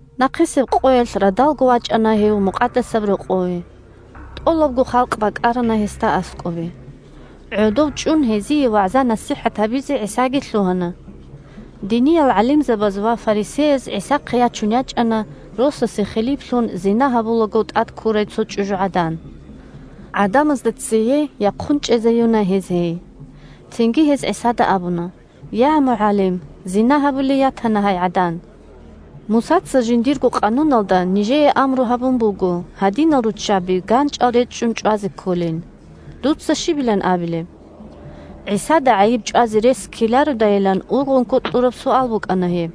Нахъисеб къоялъ радалго вачӀана гьев Мукъадасаб Рокъове. ТӀолабго халкъ бакӀарана гьесда аскӀобе. ГӀодов чӀун гьезие вагӀза-насихӀат гьабизе ГӀисаги лъугьана. Диниял гӀалимзабаз ва фарисеяз ГӀисахъе ячун ячӀана росасе хилиплъун, зина гьабулаго тӀадккурай цо чӀужугӀадан. ГӀадамазда цее яхъун чӀезаюна гьез гьей. Цинги гьез ГӀисада абуна: – Я, МугӀалим! Зина гьабулей ятана гьай гӀадан. Мусаца жиндирго къануналда нижее амру гьабун буго гьадинал руччаби ганчӀал речӀчӀун чӀвазе кколин. Дуца щибилан абилеб? ГӀисада гӀайиб чӀвазе рес ккелародайилан ургъунго кьураб суал букӀана гьеб.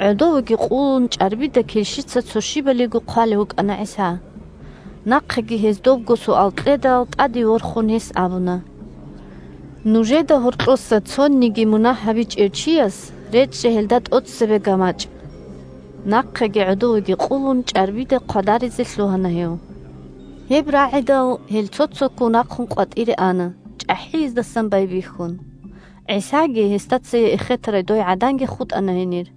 ГӀодовеги къулун, чӀарбида килщица цо щибалиго хъвалев вукӀана ГӀиса. Нахъеги гьез добго суал кьедал, тӀаде ворхун, гьес абуна: – Нужеда гьоркьоса цониги мунагь гьабичӀев чияс речӀчӀе гьелда тӀоцебе гамачӀ. Нахъеги гӀодовеги къулун, чӀарбида хъвадаризе лъугьана гьев. Гьеб рагӀидал, гьел цо-цоккун рахъун къватӀире ана, чӀахӀияздасан байбихьун. ГӀисаги гьесда цее эхетарай дой гӀаданги хутӀана гьенир.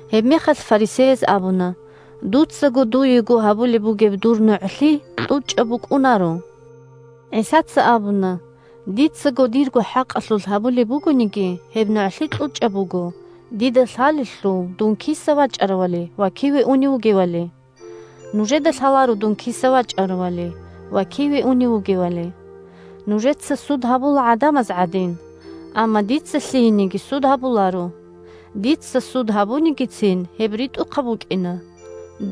Гьебмехалъ фарисеяз абуна: – Дуцаго дуего гьабулеб бугеб дур нугӀлъи кьучӀаб букӀунаро. ГӀисаца абуна: – Дицаго дирго хӀакъалъулъ гьабулеб бугониги, гьеб нугӀлъи кьучӀаб буго, дида лъалелъул дун киса вачӀаравали ва киве унев вугевали. Нужеда лъаларо дун киса вачӀаравали ва киве унев вугевали. Нужеца суд гьабула гӀадамаз гӀадин, амма дица лъиениги суд гьабуларо. Дица суд гьабунигицин, гьеб ритӀухъаб букӀина,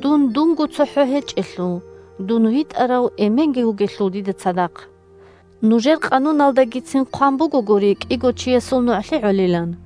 дун дунго цохӀо гьечӀелъул, дун витӀарав Эменги вугелъул дида цадахъ. Нужер къануналдагицин хъван бугогури кӀиго чиясул нугӀлъи гӀолилан.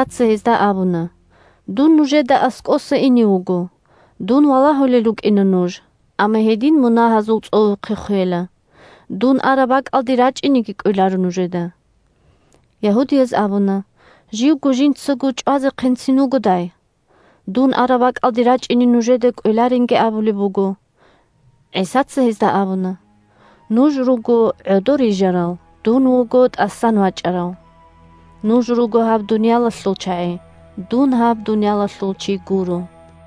Гьанжеги ГӀисаца гьезда абуна: – Дун нужеда аскӀоса ине вуго. Дун валагьулел рукӀина нуж, амма гьедин мунагьазул цӀовухъе хвела, дун араб бакӀалде рачӀинеги кӀвеларо нужеда. Ягьудияз абуна: – Живго жинцаго чӀвазехъинцин вугодай? Дун араб бакӀалде рачӀине нужеда кӀвеларинги абулеб буго. ГӀисаца гьезда абуна: – Нуж руго гӀодор рижарал, дун вуго тӀасан вачӀарав. Нуж руго гьаб дуниялалъул чагӀи, дун гьаб дуниялалъул чи гуро.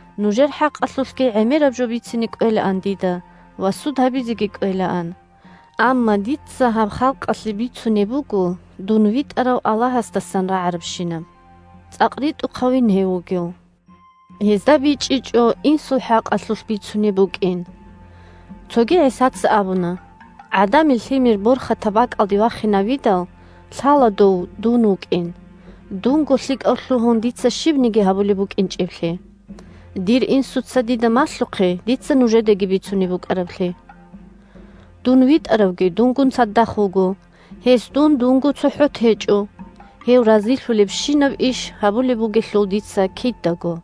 Нужер хӀакъалъулъги гӀемераб жо бицине кӀвелаан дида ва суд гьабизеги кӀвелаан. Амма дица гьаб халкъалъе бицунеб буго дун витӀарав Аллагьасдасан рагӀарабщинаб. ЦӀакъ ритӀухъавин гьев вугев! Гьезда бичӀчӀичӀо Инсул хӀакъалъулъ бицунеб букӀин. Цоги ГӀисаца абуна: – ГӀадамил Лъимер борхатаб бакӀалде вахинавидал, лъала Дов – Дун вукӀин, дунго лъикӀав лъугьун дица щибниги гьабулеб букӀинчӀеблъи, дир Инсуца дида малъухъе дица нужедаги бицунеб букӀараблъи. Дун ВитӀаравги дунгун цадахъ вуго. Гьес дун дунго цохӀо течӀо, гьев разилъулебщинаб иш гьабулеб бугелъул дица кидаго.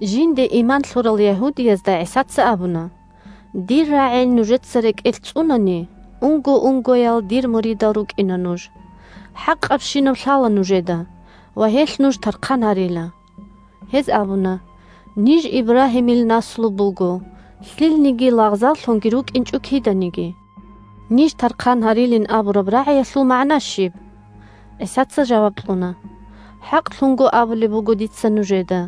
Жинде иман лъурал ягьудиязда ГӀисаца абуна: – Дир рагӀи нужеца рекӀелъ цӀунани, унго-унгоял дир муридал рукӀина нуж. ХӀакъабщинаб лъала нужеда, ва гьелъ нуж тархъан гьарила. Гьез абуна: – Ниж Ибрагьимил наслу буго, лъилниги лагъзаллъунги рукӀинчӀо киданиги. Ниж тархъан гьарилин абураб рагӀиялъул магӀна щиб? ГӀисаца жаваб кьуна: – ХӀакълъун абулеб буго дица нужеда: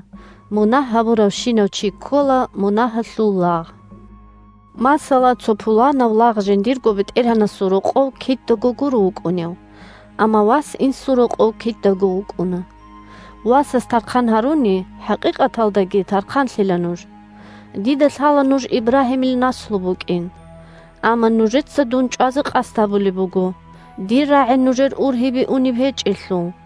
мунагь гьабуравщинав чи ккола мунагьалъул лагъ. Масала, цо пуланав лагъ жиндирго бетӀергьанасул рокъов кидаго гуро вукӀунев, амма вас инсул рокъов кидаго вукӀуна. Васас тархъан гьаруни, хӀакъикъаталдаги тархъанлъила нуж. Дида лъала нуж Ибрагьимил наслу букӀин. Амма нужеца дун чӀвазе къасд гьабулеб буго, дир рагӀи нужер ургьибе унеб гьечӀелъул.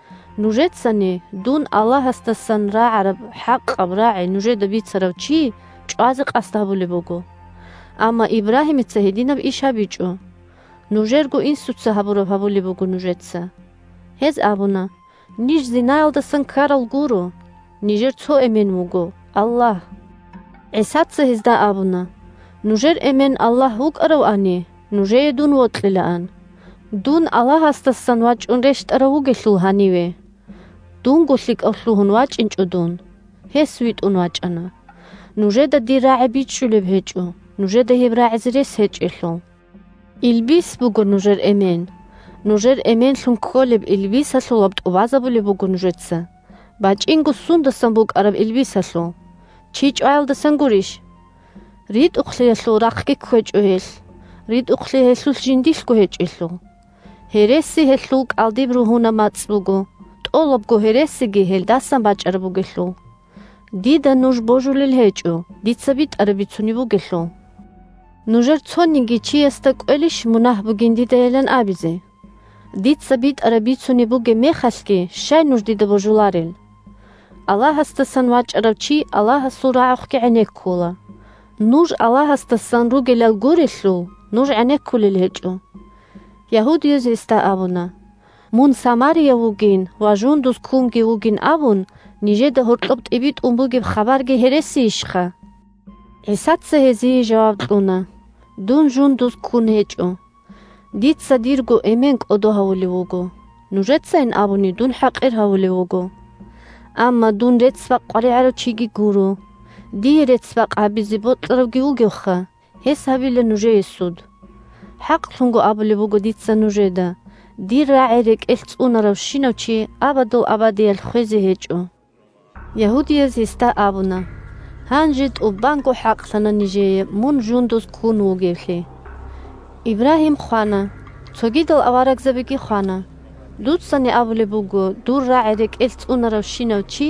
Нужецани дун – Аллагьасдасан рагӀараб хӀакъаб рагӀи нужеда бицарав чи – чӀвазе къасд гьабулеб буго. Амма Ибрагьимица гьединаб иш гьабичӀо. Нужерго инсуца гьабураб гьабулеб буго нужеца. Гьез абуна: – Ниж зинаялдасан ккарал гуро. Нижер цо эмен вуго – Аллагь! ГӀисаца гьезда абуна: – Нужер эмен Аллагь вукӀаравани, нужее дун вокьилаан. Дун Аллагьасдасан вачӀун рещтӀарав вугелъул гьаниве. Дунго лъикӀав лъугьун вачӀинчӀо дун, гьес витӀун вачӀана. Нужеда дир рагӀи бичӀчӀулеб гьечӀо, нужеда гьеб рагӀизе рес гьечӀелъул. Илбис буго нужер эмен. Нужер эменлъун кколеб илбисалъулаб тӀубазабулеб буго нужеца. БачӀинго сундасан букӀараб илбисалъул? Чи чӀваялдасан гурищ? РитӀухълъиялъул рахъги кквечӀо гьелъ, ритӀухълъи гьелъулъ жиндилъго гьечӀелъул. Гьереси – гьелъул кӀалдиб ругьунаб мацӀ буго, тӀолабго гьересиги гьелдасан бачӀараб бугелъул. Дида нуж божулел гьечӀо, дица битӀараб бицунеб бугелъул. Нужер цониги чиясда кӀвелищ мунагь бугин дидайилан абизе? Дица битӀараб бицунеб бугеб мехалъги щай нуж дида божуларел? Аллагьасдасан вачӀарав чи Аллагьасул рагӀухъги гӀенеккула. Нуж Аллагьасдасан ругелал гурелъул, нуж гӀенеккулел гьечӀо. Ягьудияз гьесда абуна: – Мун самарияв вугин ва жундуз ккунги вугин абун нижеда гьоркьоб тӀибитӀун бугеб хабарги гьересийищха? ГӀисаца гьезие жаваб кьуна: – Дун жундуз ккун гьечӀо. Дица дирго Эмен кӀодо гьавулев вуго, нужецайин абуни, дун хӀакъир гьавулев вуго. Амма дун рецц-бакъ къваригӀарав чиги гуро. Дие рецц-бакъ гьабизе бокьаравги вугевха, гьес гьабила нужее суд. ХӀакълъун абулеб буго дица нужеда: дир рагӀи рекӀелъ цӀунаравщинав чи абадул абадиялъ хвезе гьечӀо. Ягьудияз гьесда абуна: – Гьанже тӀубанго хӀакълъана нижее мун жундуз ккун вугевлъи. Ибрагьим хвана, цогидал аварагзабиги хвана. Дуцани абулеб буго дур рагӀи рекӀелъ цӀунаравщинав чи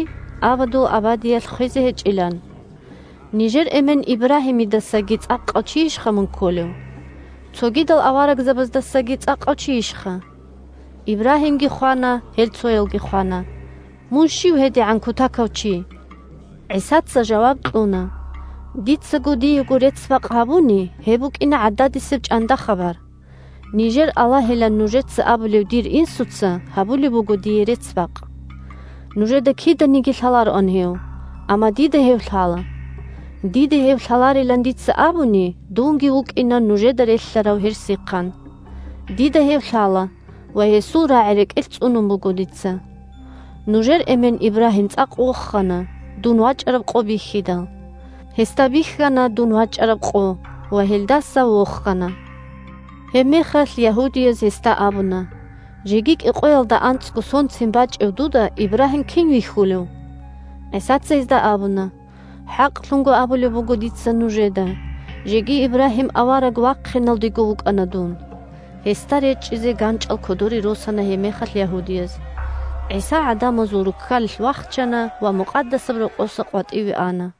абадул абадиялъ хвезе гьечӀилан. Нижер эмен Ибрагьимидасаги цӀакъав чийищха мун кколев? Цогидал аварагзабаздасаги цӀакъав чийищха? Ибрагьимги хвана, гьел цоялги хвана. Мун щив гьедигӀан кутакав чи? ГӀисаца жаваб кьуна: – Дицаго диего рецц-бакъ гьабуни, гьеб букӀина гӀададисеб чӀанда-хабар. Нижер Аллагьилан нужеца абулев дир Инсуца гьабулеб буго дие рецц-бакъ. Нужеда киданиги лъалароан Гьев. Амма дида Гьев лъала. Дида Гьев лъаларилан дица абуни, дунги вукӀина нужеда релълъарав гьерсихъан. Дида Гьев лъала ва Гьесул рагӀи рекӀелъ цӀунун буго дица. Нужер эмен Ибрагьим цӀакъ вохана, дун вачӀараб къо бихьидал. Гьесда бихьана дун вачӀараб къо ва гьелдаса вохана. Гьебмехалъ ягьудияз гьесда абуна: – Жеги кӀикъоялда анцӀго сонцин бачӀев дуда Ибрагьим кин вихьулев? ГӀисаца гьезда абуна: – ХӀакълъун абулеб буго дица нужеда: жеги Ибрагьим авараг вахъиналдего вукӀана дун. Гьесда речӀчӀизе ганчӀал кодоре росана гьебмехалъ ягьудияз. ГӀиса гӀадамазул руккалилъ вахчана ва Мукъадасаб Рокъоса къватӀиве ана.